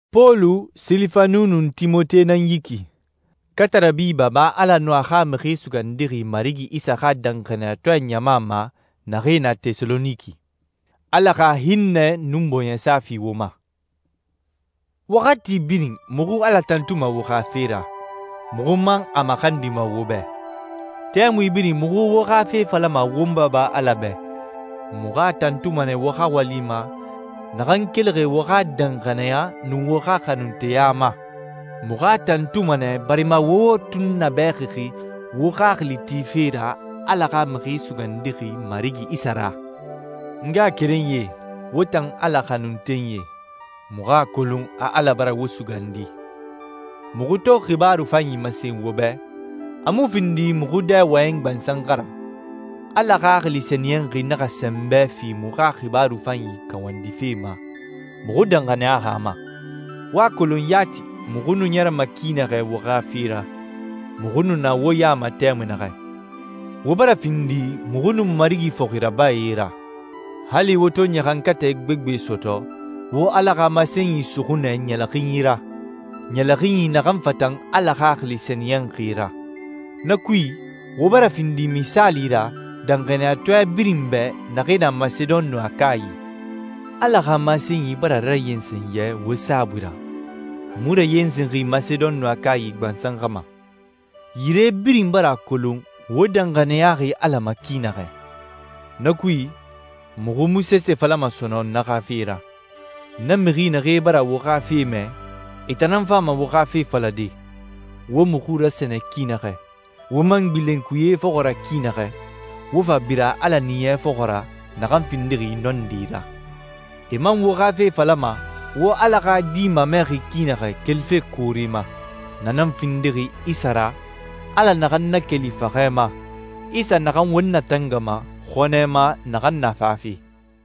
Pɔlu, Silifanu, nun Timote nan yi ki, katarabi Baba Ala nun a xa Mixi Sugandixi Marigi Isa xa danxaniyatɔɛ ɲama ma naxee na Tɛsaloniki. Ala xa hinnɛ nun bɔɲɛsa fi wo ma. Waxati birin muxu Ala tantuma wo xa fe ra, muxu man a maxandima wo bɛ. Tɛmui birin muxu wo xa fe falama won Baba Ala bɛ. Muxu a tantuma nɛ wo xa wali ma naxan kelixi wo xa danxaniya nun wo xa xanunteya ma. Muxu a tantuma nɛ barima wo wo tunnabɛxixi wo xaxili tife ra Ala xa Mixi Sugandixi Marigi Isa ra. N ngaxakerenyie, wo tan Ala xanuntenyie, muxu a kolon a Ala bara wo sugandi. Muxu to xibaaru fanyi masen wo bɛ, a mu findi muxu dɛ wɔyɛnyi gbansan xa ra. Ala Xaxili Sɛniyɛnxi naxa sɛnbɛ fi muxu xa xibaaru fanyi kawandife ma, muxu danxaniyaxi a ma. Wo a kolon yati muxu nu ɲɛrɛma ki naxɛ wo xa fe ra, muxu nu na wo ya ma tɛmui naxɛ. Wo bara findi muxu nun Marigi fɔxi rabae ra. Hali wo to ɲaxankatɛ gbegbe sɔtɔ, wo Ala xa masenyi suxu nɛ ɲɛlɛxinyi ra, ɲɛlɛxinyi naxan fatan Ala Xaxili Sɛniyɛnxi ra. Na kui, wo bara findi misaali ra danxaniyatɔɛ birin bɛ naxee na Masedon nun Akayi. Ala xa masenyi bara rayensen yɛ wo saabui ra. A mu rayensenxi Masedon nun Akayi gbansan xa ma. Yire birin bara a kolon wo danxaniyaxi Ala ma ki naxɛ. Na kui, muxu mu sese falama sɔnɔn na xa fe ra. Na mixi naxee bara wo xa fe mɛ, e tan nan fama wo xa fe falade, wo muxu rasɛnɛ ki naxɛ, wo man gbilen kuyee fɔxɔ ra ki naxɛ, wo fa bira Ala Ɲiɲɛ fɔxɔ ra naxan findixi nɔndi ra. E man wo xa fe falama, wo Ala xa Di mamɛxi ki naxɛ kelife koore ma. Na nan findixi Isa ra, Ala naxan nakeli faxɛ ma, Isa naxan won natangama xɔnɛ ma naxan na fafe.